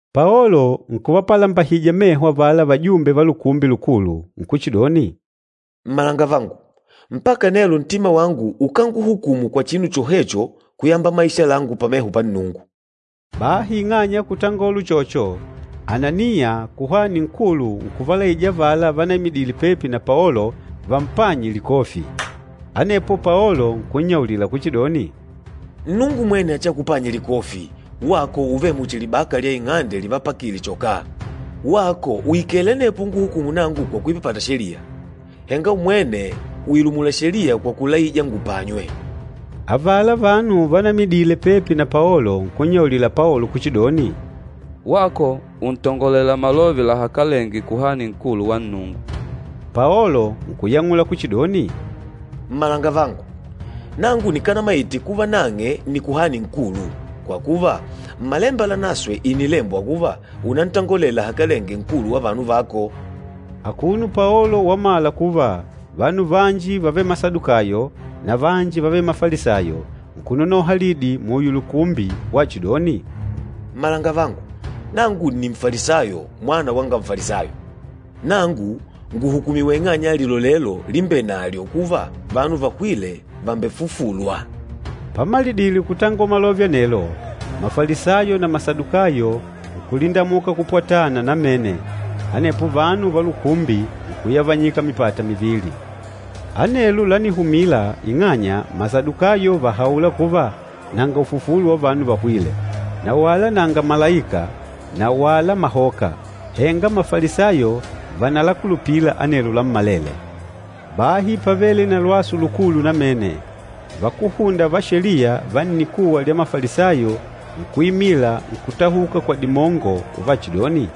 Paolo nkuvapalambahija meho avala vajumbe va Lukumbi Lukulu, nkuchidoni, “Mmalangavangu, mpaka nelo ntima wangu ukánguhukumu kwa chinu chohecho kuyamba maisha langu pameho pa Nnungu.” Bahi ing'anya ya kutangola uchocho, Ananiya kuhani nkulu nkuvalaija avala vanaimidile pepi na Paolo vampanye likofi. Anepo Paolo nkunnyaulila kuchidoni, “Nnungu mwene achiakupanye likofi, wako uvêle muchi libaka lya ing'ande livapakile chokaa! Wako ùikele anepo unguhukùmù nangu kwa kuipapata sheliya. Henga umwene uilumula sheliya kwa kulaija ngupanywe!” Avala vanu vanaimidile pepi na Paolo, nkunnyaulila Paolo kuchidoni, “Wako untongolela malove lahakalenge Kuhani Nkulu wa Nnungu!” Paolo nkuyang'ula kuchidoni, “Mmalangavangu, nangu nikanamaite kuva nang'e nni Kuhani Nkulu. Kwa kuva, Mmalemba Lanaswe ìnilembwa kuva, ‘Unantangolele lahakalenge nkulu wa vanu vako.’” Akuno Paolo wamala kuva vanu vanji vávele Masadukayo na vanji vávele Mafalisayo, nkunonoha lidi muyo lukumbi wachidoni, “Mmalangavangu, nangu nni Nfalisayo mwana wanga Nfalisayo. Nangu ngùhukumiwa ing'anya ya lilolelo limbenalyo kuva vanu vahwîle vàmbefufulwa.” Pamalidile kutangola malove anelo, Mafalisayo na Masadukayo nkulindamuka kupwatana namene, anepo vanu va lukumbi nkuyavanyika mipata mivili. Anelo lánihumila ing'anya Masadukayo vàhaula kuva nanga ufufulo wa vanu vahwîle, na wala nanga malaika na wala mahoka, henga Mafalisayo vànalakulupila anelo lammalele. Bahi pávele na lwasu lukulu namene, vakúhunda va Sheliya va nnikuwa lya Mafalisayo nkuimila nkutahuka kwa dimongo uvachidoni,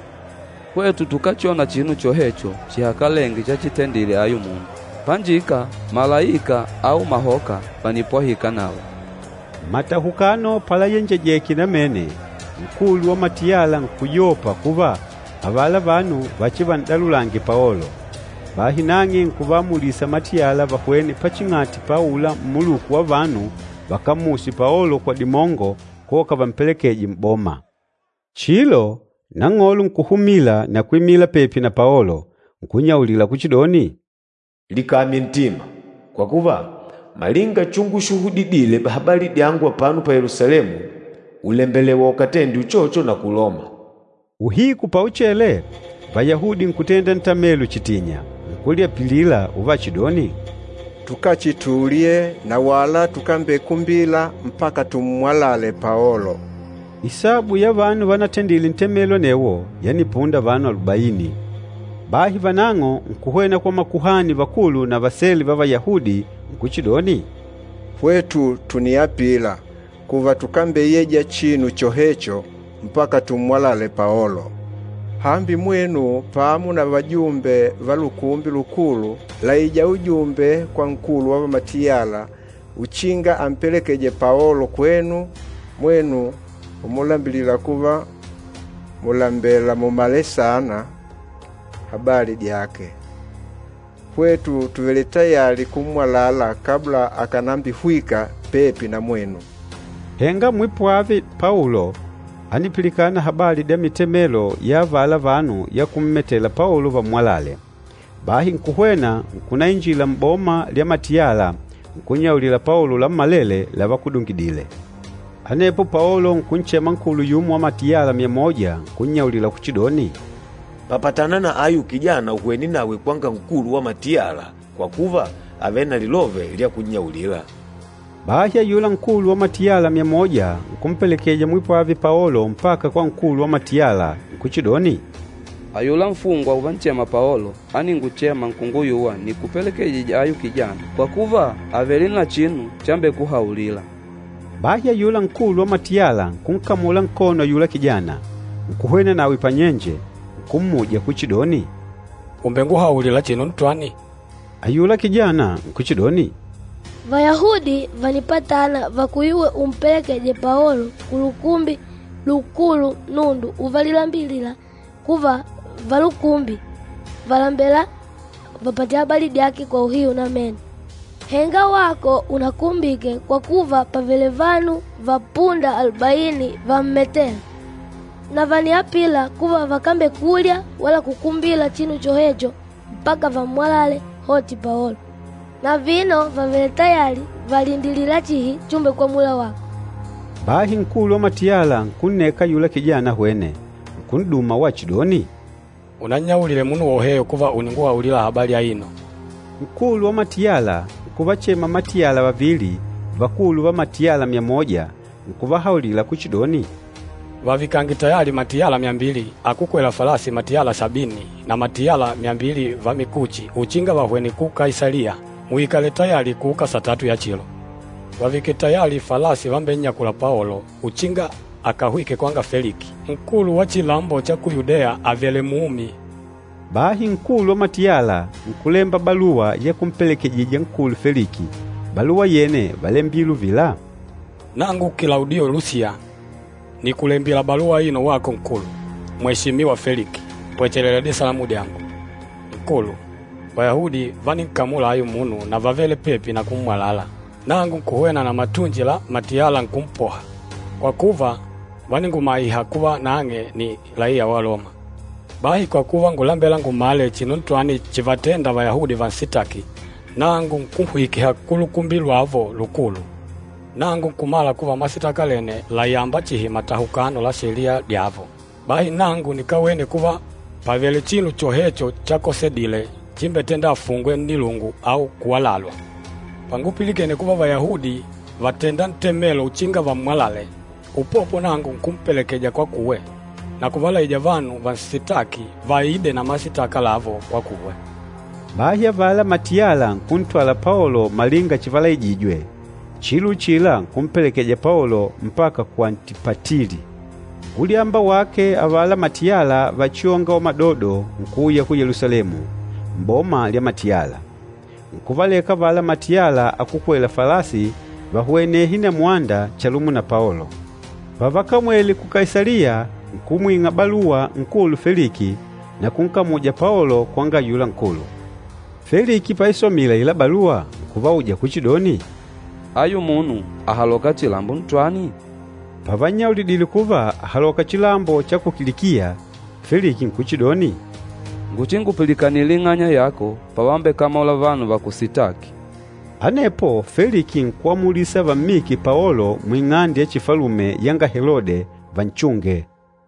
“Hwetu tukáchona chinu chohecho chihakalenge chachitendile ayu munu. Panjika malaika au mahoka vànipwahika nawe.” Matahukano palayenjejeke namene, nkulu wa matiyala nkuyopa kuva avala vanu vachivan'dalulange Paolo. Bahi nang'e nkuvaamulisa matiyala vahwene paching'ati pa aula mmuluku wa vanu vakammuse Paolo kwa dimongo koka vampelekeje m'boma. Chilo, Nang'olo nkuhumila na kwimila pepi na Paolo, nkunnyaulila kuchidoni, “Likamye ntima! Kwa kuva, malinga chushuhudidile habali dyangu apano pa Yelusalemu, ùlembelewa akatende uchocho na ku Loma.” Uhiku pauchele, Vayahudi nkutenda ntamelo chitinya. Nkulyapilila uvachidoni, “Tukachitulye na wala tukambekumbila mpaka tummwalale Paolo.” Isabu ya vanu vanatendile ntemelo anewo yanipunda vanu alubaini. Bahi vanang'o nkuhwena kwa makuhani vakulu na vasele va Vayahudi nkuchidoni, “Hwetu tùniapila kuva tukambeyeja chinu chohecho mpaka tummwalale Paolo. Hambi, mwenu pamo na vajumbe va Lukumbi Lukulu làija ujumbe kwa nkulu wa matiyala uchinga ampelekeje Paolo kwenu mwenu umulambilila kuva mùlembela mumale saana habali dyake. Hwetu tùvele tayali kummwalala kabla akànambihwika pepi na mwenu.” Henga mwipwave Paolo ánipilikana habali dya mitemelo ya avala vanu ya kummetela Paolo vammwalale. Bahi nkuhwena, nkunainjila m'boma lya matiyala nkunnyaulila Paolo lammalele lavakudungidile. Anepo Paolo nkunchema nkulu yumo wa matiyala myamoja nkunnyaulila kuchidoni, “Papatana na ayu kijana uhwene nawe kwanga nkulu wa matiyala kwa kuva àvele na lilove lya kunnyaulila.” Bahi ayula nkulu wa matiyala myamoja nkumpelekeja mwipwave Paolo mpaka kwa nkulu wa matiyala, nkuchidoni, “Ayula nfungwa uvanchema Paolo áninguchema nkunguyuwa nikupelekejije ayu kijana kwa kuva àvele na chinu chambekuhaulila.” Bahi ayula nkulu wa matiyala nkunkamula nkono ayula kijana, nkuhwena nawe panyenje, nkummuja kuchidoni, “Ùmbenguhauli chinu ntwani?” Ayula kijana nkuchidoni, “Vayahudi vànipatana vakuyuwe umpelekeje Paolo ku Lukumbi Lukulu nundu uvalilambilila kuva valukumbi vàlembela vapate habali dyake kwa uhiu namene. Henga wako unakumbike kwa kuva pàvele vanu vapunda alubaini vammetêla. Na vàniapila kuva vakambekulya wala kukumbila chinu chohecho mpaka vammwalale hoti Paolo. Na vino vàvele tayali, vàlindilila chihi chumbekwamula wako.” Bahi nkulu wa matiyala nkunneka ayula kijana ahwene, nkun'duma wachidoni, “Unannyaulile munu woheyo kuva ùninguhaulila habali aino.” Nkulu wa matiyala nkuvachema matiyala vavili, vakulu va matiyala myamoja nkuvahauli kuchidoni, “Vavikange tayali matiyala myambili, akúkwela falasi matiyala sabini na matiyala myambili va mikuchi uchinga vahwene ku Kaisaliya, muikale tayali kuuka satatu ya chilo. Vavike tayali falasi vambennyakûla Paolo uchinga akahwike kwanga Feliki, nkulu wa chilambo cha ku Yudeya, avèlè mumi.” Bahi nkulu wa matiyala nkulemba baluwa ya kumpelekejija nkulu Feliki, baluwa yene válembile uvila, “Nangu Kilaudiyo Lusiya, nìkulembila baluwa aino wako Nkulu, Mweshimiwa Feliki. Pwechelela disalamu dyangu. Nkulu, Vayahudi váninkamula ayu munu na vávele pepi na kummwalala, nangu nkuhwena na matunji la matiyala nkumpoha, kwa kuva, váningumaiha kuva nang'e nni laiya wa Loma. Bahi kwa kuva ngúlembela ngumale chinu ntwani chívatèndà Vayahudi vansitaki, nangu nkunhwikiha ku Lukumbi lwavo Lukulu. Nangu nkumala kuva masitaka lene làyamba chihi matahukano la sheliya dyavo. Bahi nangu nikawene kuva pàvele chinu chohecho chakosedile chímbetèndà afungwe nnilungu au kuwalalwa. Pangupilikene kuva Vayahudi vàtenda ntemelo uchinga vammwalale, upopo nangu nkumpelekeja kwakuwe, na kuvalaija vanu vansitâki vaide na masitaka lavo kwakuwe.” Bahi avala matiyala nkuntwala Paolo malinga chivalaijijwe, chilo uchila nkumpelekeja Paolo mpaka ku Antipatili. Ulyamba wake avala matiyala vachiônga wamadodo nkuuya ku Yelusalemu, m'boma lya matiyala. Nkuvaleka avala matiyala akúkwela falasi vahwenehe na mwanda chalumo na Paolo. Pavakamwele ku Kaisaliya nkumwing'a baluwa nkulu Feliki na kunkamuja Paolo kwanga ayula nkulu. Feliki paisomile aila baluwa, nkuvauja kuchidoni, “Ayu munu àhaloka chilambo ntwani?” Pavannyaulidile kuva àhaloka chilambo cha ku Kilikiya, Feliki nkuchidoni, “Nguchingupilikanile ing'anya yako pavambekamola vanu vakusitâki.” Anepo Feliki nkuamulisa vammike Paolo muing'ande ya chifalume yanga Helode, vanchunge.